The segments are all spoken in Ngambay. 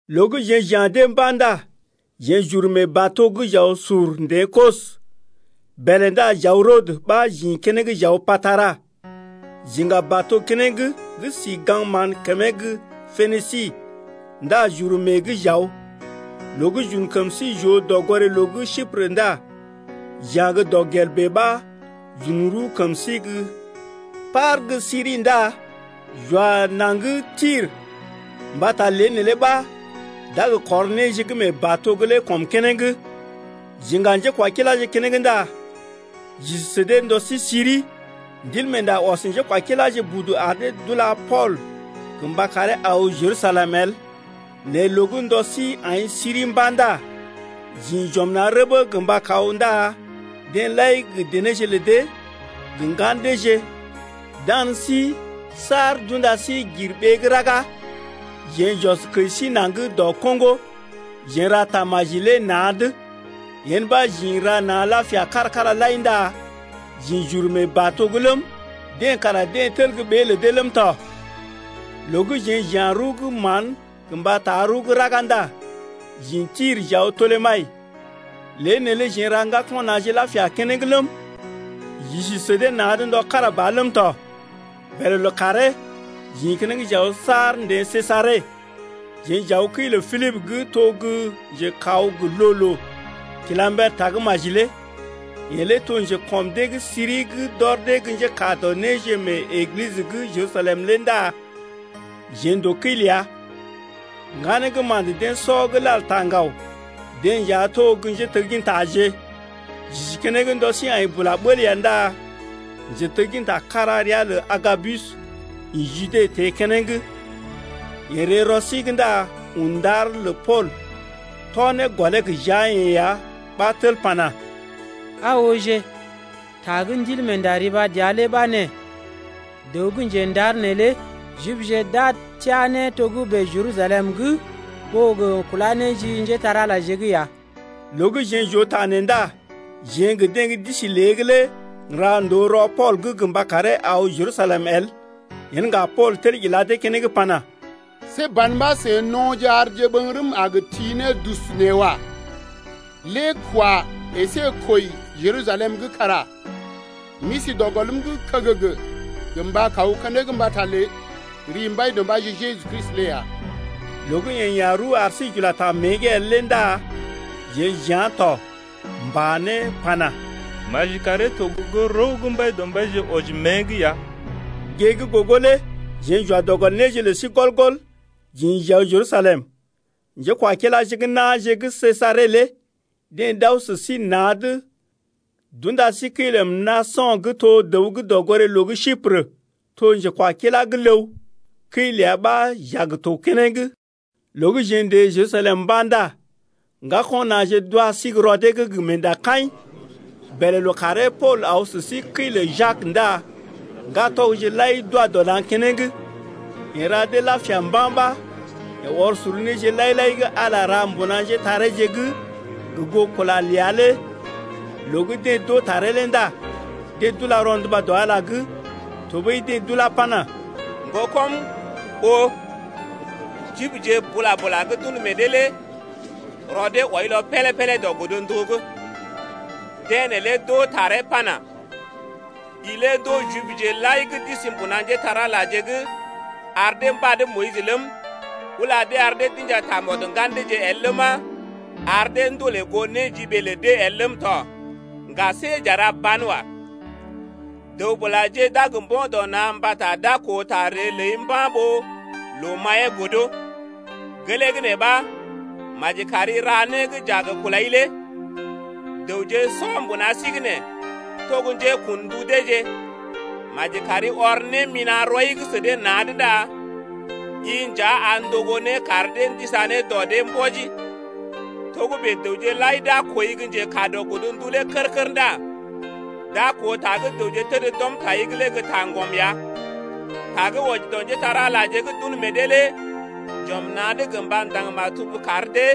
Loo gə́ jeḛ j’ya̰ dee mba̰ ndá jeḛ j’uru mee bato’g j’aw sur n’teḛ Kos. Bèlè ndá j’aw Rodə ɓa j’ḭ keneŋ j’aw Patara. J’iŋga bato keneŋ gə́ si gaŋg mán kəmee gə́ Penisi ndá j’uru mée’g j’aw. Loo gə́ j’un kəm sí j’oo dɔgoré-loo gə́ Siprə ndá j’ya̰ gə́ dɔgel bèe ɓa j’un rəw kəm sí gə́ par gə́ Siri ndá j’wa naŋg Tir, mbata lée neelé ɓa d’a gə kɔr néje gə́ mee bato’g lé kɔm keneŋ. J’iŋga njékwakiláje keneŋ ndá j’isi sə dee ndɔ sí siri. Ndilmeenda ɔs njékwakiláje budu ar dee d’ula Pool gə mba karee aw Jerusalem el. Nɛ Loo gə́ ndɔ sí aḭ siri mba̰ ndá j’ḭ j’ɔm na̰ rəbə gə mba kaw ndá deḛ lai gə denéje lə dee gə ŋgan deeje dan sí saar d’unda sí gir ɓee gə́ raga. Jeḛ j’ɔs kəji sí naŋg dɔ koŋgo, jeḛ n’ra tamaji lé na̰’d. Yen ɓa j’ḭ n’ra na̰ lapia kára-kára lai ndá j’ḭ j’uru mee bato’g ləm, deḛ kara deḛ tel gə́ ɓée lə dee ləm tɔ. Loo gə́ jeḛ j’ya̰ rəw gə́ mán gə mba taa rəw gə́ raga ndá j’ḭ Tir j’aw Tolemayis. Lée neelé jeḛ n’ra ŋgako̰ na̰je lapia keneŋ ləm, j’isi sə dee na̰’d ndɔ kára ɓa ləm tɔ. Bèlè lookàree j’ḭ keneŋ j’aw saar n’teḛ Sejare. Jeḛ j’aw kəi lə Pilibə gə́ to gə́ njekaw gə loo-loo kila mber tagə́maji lé. Yeḛ lé to njekɔm dee gə́ siri gə́ d’ɔr dee gə́ njékaa dɔ néje mee Eglisə gə́ Jerusalem lé ndá jeḛ n’to kəi ləa. Ŋganee gə́ ma̰də deḛ sɔ gə́ lal taa ŋgaw, deḛ nja to gə́ njéteggintaje. J’isi keneŋ ndɔ sí aḭ bula bəl ya ndá njetegginta kára ria lə Agabus ḭ Jude teḛ keneŋ. Yeḛ ree rɔ sí’g ndá un ndar lə Pool tɔ ne gɔlee gə jia-yeḛ ya ɓa tel pana: Aa ooje, ta gə́ Ndilmeenda riba dəa lé ɓa nee: Dəw gə́ njendar neelé Jibje d’a teá ne togə́bè Jerusalem’g ɓó gə kulá ne ji njépole-magəje’g ya. Loo gə́ jeḛ j’oo ta nee ndá jeḛ gə deḛ gə́ d’isi lée’g lé n’ra ndòo rɔ Pool’g gə mba karee aw Jerusalem el. Yen ŋga Pool tel ila dee keneŋ pana: See ban ɓa seḭ no̰je arje ɓəŋgərəm a gə ti ne dus nee wa. Lée kwa əsé kwəi Jerusalem’g kara m’isi dɔ gɔlm’g kəgəgə gə mba kaw keneŋ mbata lə ri Mbaidɔmbaije Jeju Kristi lé ya. Loo gə́ yeḛ ya̰ rəw ar sí j’ula ta mée’g el lé ndá jeḛ j’yá̰ tɔ, m’pa ne pana: Maji karee to gə goo rəw gə́ Mbaidɔmbaije wɔji mée’g ya. Gée gə́ gogo lé jeḛ j’wa dɔ gɔl néje lə sí gɔl-gɔl j’ḭ j’aw Jerusalem. Njékwakiláje gə́ na̰je gə́ Sejare lé deḛ d’aw sə sí na̰’d d’unda sí kəi lə Mnaso̰ gə́ to gə́ dəw gə́ dɔgoré-loo gə́ Siprə. To njekwakila gə́ ləw, kəi ləa ɓa j’a gə to keneŋ. Loo gə́ jeḛ n’teḛ Jerusalem mba̰ ndá ŋgako̰ na̰je d’wa sí gə́ rɔ dee’g gə meendakaḭ. Bèlè lookàree Pool aw sə sí kəi lə Jak ndá ŋgatɔgje lai d’wa dɔ na̰ keneŋ. Yeḛ ra dee lapia mba̰ ɓa yeḛ ɔr sor néje lai-lai gə́ Ala ra mbuna njétareeje’g gə goo kula’g ləa lé. Loo gə́ deḛ d’oo taree lé ndá deḛ d’ula rɔnduba dɔ Ala’g. Tɔɓəi deḛ d’ulá pana: Ŋgokɔm oo, Jibje bula-bula gə́ d’un meḛ dee lé rɔ dee wɔilɔ pélé-pélé dɔ godndu’g. Deḛ neelé d’oo taree pana: I lé ndoo Jibje lai gə́ d’isi mbuna njépole-magəje’g ar dee mbad Moyis ləm, ula dee ar dee d’inja tamɔd ŋgan deeje el ləma, ar dee ndolè goo néjiɓee lə dee el ləm tɔ. Ŋga see j’a ra banwa. Dəw-bulaje d’a gə mbo̰ dɔ na̰ mbata d’a koo ta ree ləi mba̰ ɓó loo maḭyee godo. Gelee gə́ nee ɓa maji kari ra né gə́ j’a gə kulai lé. Dəwje sɔ mbuna sí’g nee to gə́ njekun ndu deeje. Maji kari ɔr némina̰ rɔi’g sə dee na̰’d ndá i nja a ndogo né kar dee ndisa ne dɔ dee mbɔji. Togə́bè dəwje lai d’a kooi gə́ njekaa dɔ godndu lé kər-kər ndá d’a koo ta gə́ dəwje təd d’ɔm tai’g lé gə́ taŋgɔm ya. Ta gə́ wɔji dɔ njépole-magəje gə́ d’un meḛ dee lé j’ɔm na̰’d gə mba ndaŋg maktub kar dee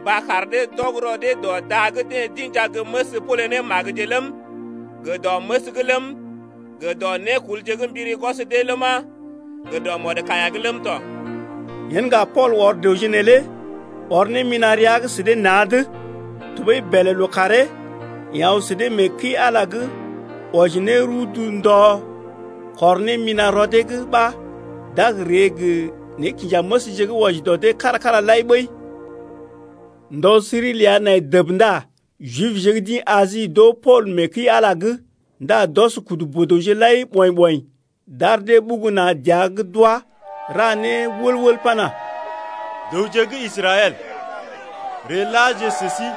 mba kar dee d’ɔg rɔ dee dɔ da gə́ deḛ d’inja ne məs pole ne magəje ləm, gə dɔ məs’g ləm, gə dɔ nékulje gə́ mbiri gwɔs dee ləma, gə dɔ mɔdkaiya’g ləm tɔ. Yen ŋga Pool ɔr dəwje neelé ɔr némina̰ rəa’g sə dee na̰’d. Tɔɓəi bèlè lookàree yeḛ aw sə dee mee kəi-Ala’g wɔji ne rudu ndɔ kɔr némina̰ rɔ dee’g ɓa d’a gə ree gə nékinjanéməsje gə́ wɔji dɔ dee kára-kára lai ɓəi. Ndɔ siri ləa nai dəb ndá Jibje gə́ d’ḭ Asi d’oo Pool mee kəi-Ala’g ndá d’ɔs kudu boo-dəwje lai ɓɔḭ-ɓɔḭ d’ar dee ɓugu na̰ dəa’g d’wá ra né wəl-wəl pana: Dəwje gə́ Israɛl, ree laje sə sí!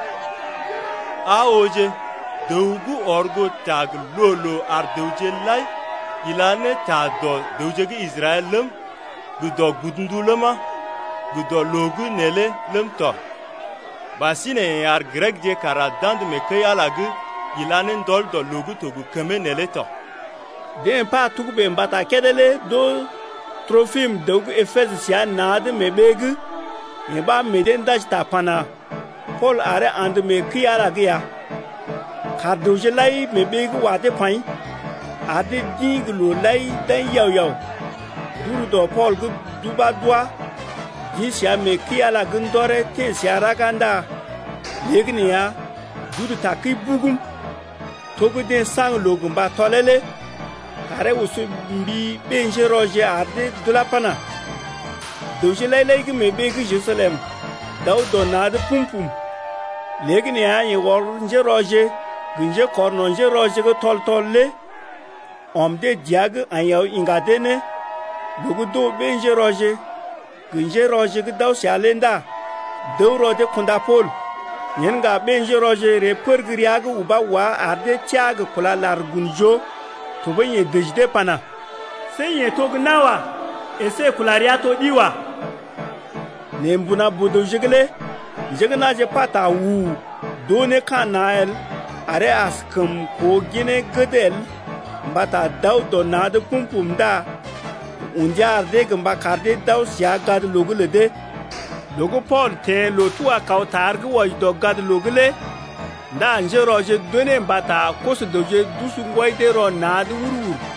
Aa ooje dəw gə́ ɔr goo ta gə loo-loo ar dəwje lai ila ne ta dɔ dəwje gə́ Israɛl ləm, gə dɔ godndu’g ləma, gə dɔ loo’g neelé ləm tɔ. Ɓasinè yeḛ ar Grekje kara d’andə mee kəi-Ala’g ila ne ndɔl dɔ loo gə́ to gə kəmee neelé tɔ. Deḛ pa togə́bè mbata kédé lé d’oo Tropim, dəw gə́ Epesə səa na̰’d mee ɓee’g, yee ɓa meḛ dee ndaji ta pana: Pool aree andə mee kəi-Ala’g ya. Kaar dəwje lai mee ɓee’g wa dee paḭ, ar dee d’ḭ gə loo lai d’aḭ yao-yao. D’ur dɔ Pool’g d’ubá d’wá d’ḭ səa mee kəi-Ala’g ndɔree teḛ səa raga ndá léegəneeya d’udu takəi bugum. To gə́ deḛ saŋg loo gə mba tɔlee lé taree oso mbi ɓé-njérɔje ar dee d’ulá pana: Dəwje lai-lai gə́ mee ɓee gə́ Jerusalem d’aw dɔ na̰’d pum-pum. Léegəneeya yeḛ ɔr njérɔje gə njékɔrno̰ njérɔje gə́ tɔl-tɔl lé ɔm dee dəa’g aḭ aw iŋga dee ne. Loo gə́ d’oo ɓé-njérɔje gə njérɔje gə́ d’aw səa lé ndá d’əw rɔ dee kunda Pool. Yen ŋga ɓé-njérɔje ree pər gə́ rəa’g ubá wá ar dee teá gə kúla lar gun joo. Tɔɓəi yeḛ dəji pana: See yeḛ to gə́ nawa əsé kula rəa to ɗi wa. Nɛ mbuna boo-dəwje’g lé njé gə́ na̰je pata u-u-u d’oo ne ka̰ na̰ el aree askəm koo ginee gəd el mbata d’aw dɔ na̰’d pum-pum ndá yeḛ un ndia ar dee gə mba kar dee d’aw səa gadloo’g lə dee. Loo gə́ Pool teḛ Pool loo-tuga-kaw-tar gə́ wɔji dɔ gadloo’g lé ndá njérɔje d’unee mbata koso-dəwje d’usu ŋgwɔi dee rɔ na̰’d wur-wur.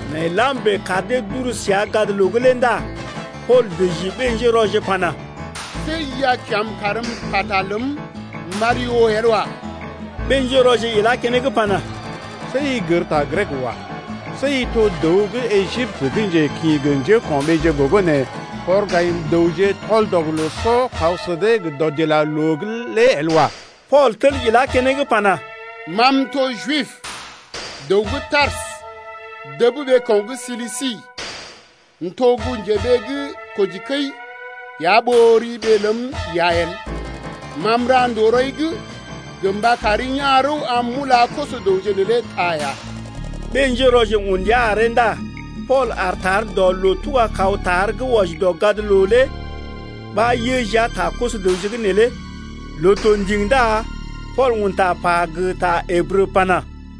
Nai lam bèe kar dee d’uru səa gadloo’g lé ndá Pool dəji ɓé-njérɔje pana: See i a kya̰’m karm m’pata ləm m’ari oo el wa. Ɓé-njérɔje ilá keneŋ pana: See i gər ta Grek wa. See i to dəw gə́ Ejiptə gə́ njekḭ gə njéko̰ɓeeje gogo nee kɔr gayim-dəwje tɔl-dɔg-loo-sɔ kaw sə dee gə dɔdilaloo’g lé el wa. Pool tel ilá keneŋ pana: Ma m’to Jib, dəw gə́ Tarsə dəb ɓeeko̰ gə́ Silisi. M’to gə́ njeɓee gə́ kojikəi ya ɓó ri ɓee ləm iya el. Ma m’ra ndòo rɔi’g gə mba kari ya̰ rəw am m’ula koso-dəwje neelé ta ya. Ɓé-njérɔje un ndia aree ndá Pool aar tar dɔ loo-tuga-kaw-tar gə́ wɔji dɔ gadloo’g lé ɓa yə jia ta koso-dəwje’g neelé. Loo to ndiŋ ndá paul un ta pa gə ta Ǝbrə pana: